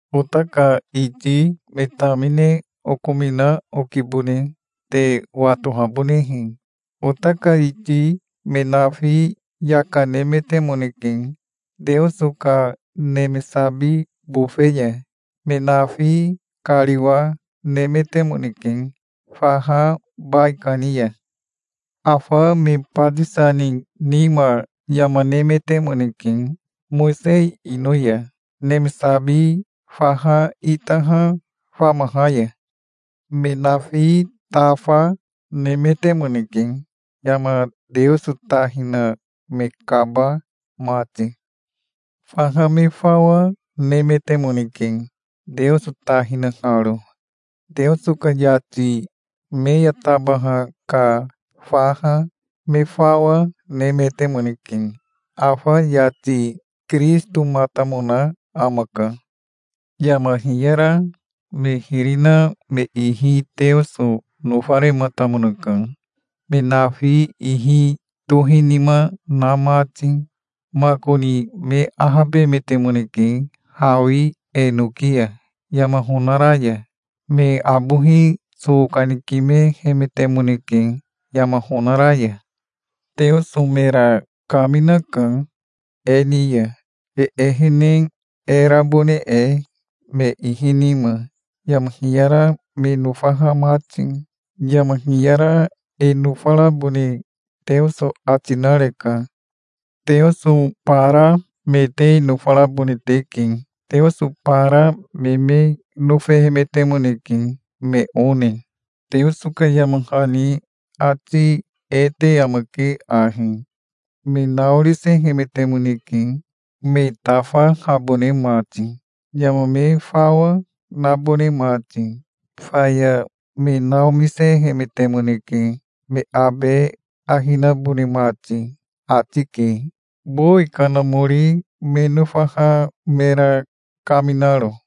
Ota ka iti me tamine okomina okibone, te watohabonehe. Ota ka iti me nafi yaka nemetemoneke Teoso ka neme sabi bofe ya. Me nafi kariwa nemetemoneke faha baikani ya. Afa me batisa ni nima yama nemetemoneke, Mowisei ino ya, neme sabi faha itaha famaha ya. Me nafi tafa nemetemoneke, yama Teoso ta hina me kaba mati. Faha me fawa nemetemoneke, Teoso ta hinaharo. Teoso ka yati me ya tabaha ka faha me fawa nemetemoneke. Afa yati Kirisitomatamona amaka. Yama hiyara me hiri na me ihi Teoso nofarematamonaka, me nafi ihi tohinima na mati. Makoni me ahabemetemoneke hawi enoki ya, yama honara ya. Me abohi so kanikimehemetemoneke yama honara ya. Teoso mera kaminaka e ni ya, e ehene e rabone e, me ihi nima, yama hiyara me nofaha mati. Yama hiyara e nofarabone Teoso ati nareka. Teoso bara me te nofarabone teke. Teoso bara me me nofehemetemoneke me one. Teoso ka yama hani ati e te amake ahi: "Me naorisehemetemoneke, me tafahabone mati, yama me fawa, nabone mati. Faya me naomisehemetemoneke, me abe ahi nabone mati", ati ke, bowi kanamori me nofaha mera kaminaro.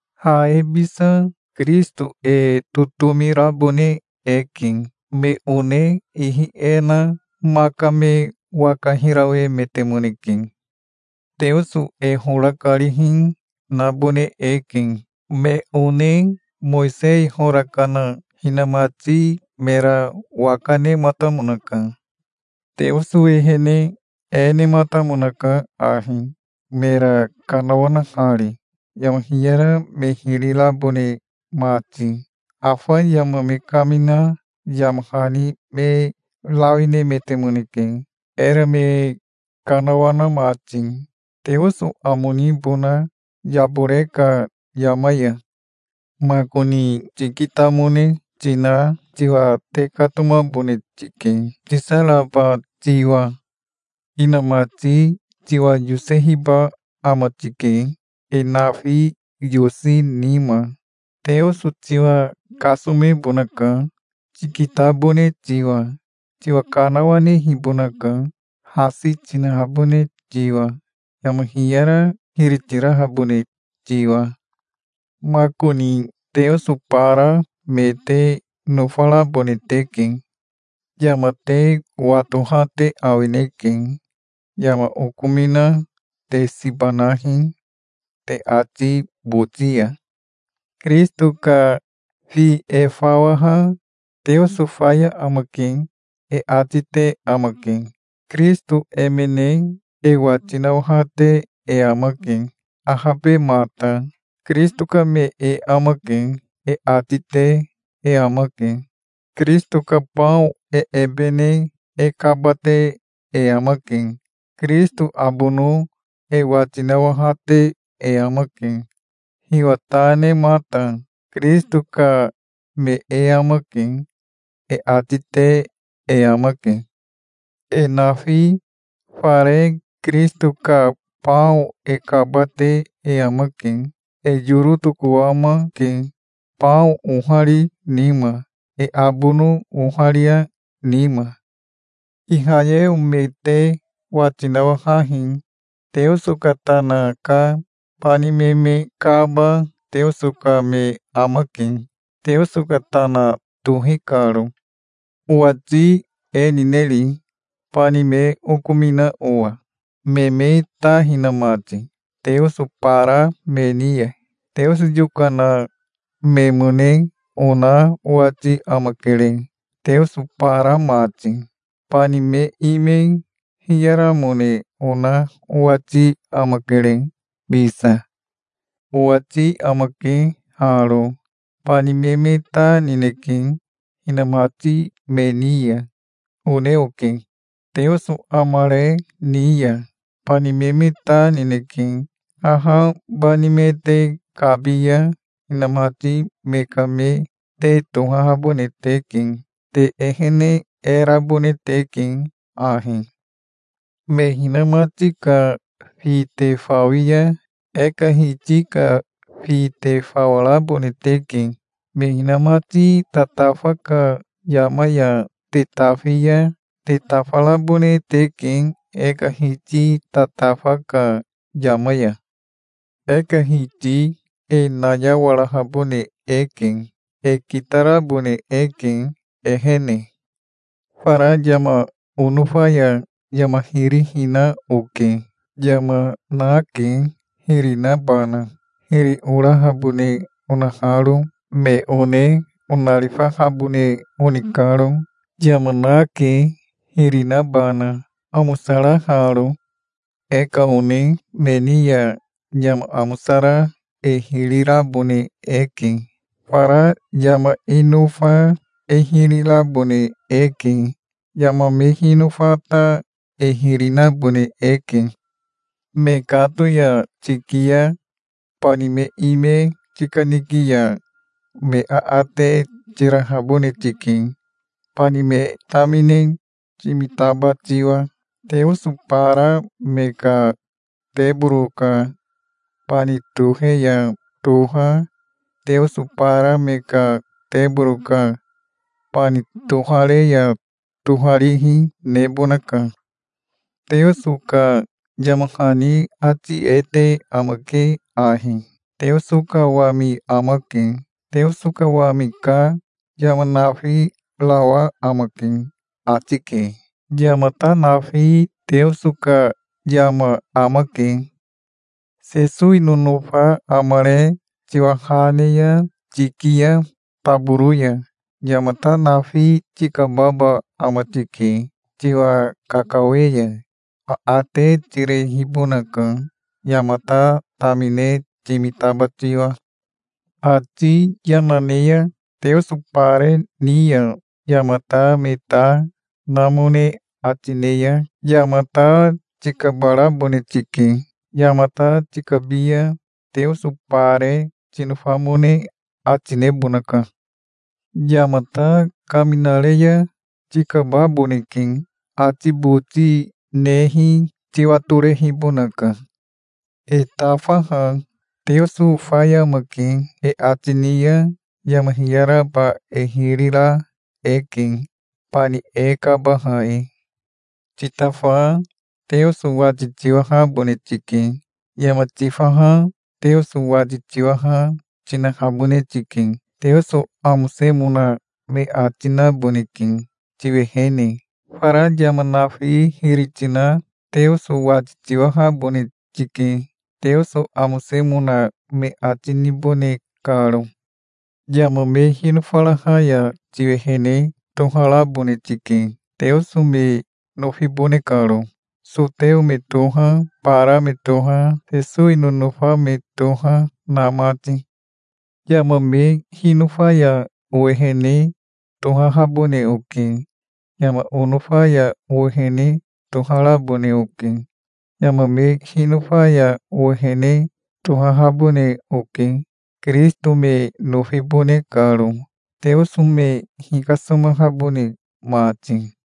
Ha e bisa Kirisito e totomi rabone eke. Me one ihi e na maka me waka hirawemetemoneke. Teoso e hora karihi nabone eke. Me one Mowisei hora kana hinamati mera waka nematamonaka. Teoso ehene e nematamonaka ahi, mera kanawanahari, yama hiyara me hiri rabone mati. Afa yama me kamina yama hani me rawi nemetemoneke, era me kanawana mati, Teoso amo nibona yabore ka yama ya. Makoni tikitamone tina tiwa tekatomabone tike, tisaraba tiwa. Inamati tiwa yosehiba ama tike, e nafi yosi nima. Teoso tiwa kasomebonaka, tikitabone tiwa. Tiwa kanawanehibonaka, hasi tinahabone tiwa, yama hiyara hiri tirahabone tiwa. Makoni teoso bara me te nofarabone teke. Yama te watoha te awineke. Yama okomina te siba nahi, te ati boti ya. Kirisito ka fi e fawaha, "Teoso faya amake", e ati te amake. Kirisito emene e wati nawahate e amake, ahabemata. "Kirisito ka me e amake", e ati te e amake. Kirisito ka bao e ebe ne e kaba, te e amake. Kirisito abono e wati nawahate e amake, hiwa ta nemata. "Kirisito ka me e amake", e ati te e amake. E nafi fare Kirisito ka bao e kabate e amake. E yoro tokowamake, bao ohari nima, e abono oharia nima. Ihayeo me te wati nawahahi. Teoso ka tana ka bani me me kaba Teoso ka me amake, Teoso ka tana tohi karo. Owati e nineri, bani me okomina owa, me me ta hina mati, teoso bara me ni ya? Teoso yokana memone ona owati amakere, teoso bara mati. Bani me ime hiyaramone ona owati amakere bisa. Owati amake haro: Bani me me ta nineke hinamati me ni ya, one oke. Teoso amare ni ya bani me me ta nineke. Haha bani me te kabi ya hinamati me ka me te tohahabone teke. Te ehene e rabone teke ahi. Me hinamati ka fi te fawi ya e ka Hiti ka fi te fawarabone teke. Me hinamati tatafa ka yama ya te tafi ya te tafarabone teke e ka Hiti tatafa ka yama ya. E ka Hiti e nayawarahabone eke. E kitarabone eke, ehene. Fara yama onofa ya yama hiri hina oke. Yama nake, hiri nabana, hiri orahabone onaharo, me one onarifahabone oni karo. Yama nake, hiri nabana, amosaraharo. E ka one me ni ya yama amosara e hiri rabone eke. Fara yama e nofa e hiri rabone eke. Yama me hinofa ta e hiri nabone eke. Mekato ya tiki ya bani me ime tikaniki ya me aate tirahabone tike, bani me tamine timitaba tiwa. Teoso bara me ka teboro ka bani tohe ya toha, teoso bara me ka teboro ka bani tohare ya toharihi, nebonaka. Teoso ka yama hani ati e te amake ahi: "Teoso ka wami amake. Teoso ka wami ka yama nafirawa amake", ati ke. Yamata nafi Teoso ka yama amake. Sesowi nonofa amare tiwa ha ne ya tiki ya taboro ya, yamata nafi tikababa ama tike, tiwa kakawe ya. Aate tirehibonaka, yamata tamine timitaba tiwa. Ati yana ne ya teoso bare ni ya yamata me ta namone ati ne ya yamata tikabarabone tike. Yamata tikabi ya teoso bare tinofamone ati nebonaka. Yamata kaminare ya tikababoneke. Ati boti nehi tiwatorehibonaka. E tafaha, "Teoso faya amake", e ati ni ya yama hiyaraba e hiri ra eke, bani e kabaha e. Titafa Teoso wati tiwahabone tike. Yama tifaha Teoso wati tiwaha, tinahabone tike. Teoso amosemona me ati naboneke tiwehene. Fara yama nafi hiri tina Teoso wati tiwahabone tike, Teoso amosemona me ati nibone karo. Yama me hinofaraha ya tiwehene toharabone tike, Teoso me nofibone karo. Soteo me toha, bara me toha, Sesowi nonofa me toha, na mati. Yama me hinofa ya owehene tohahabone oke. Yama onofa ya owehene toharabone oke. Yama me hinofa ya owehene tohahabone oke, Kirisito me nofibone karo, Teoso me hikasomahabone mati.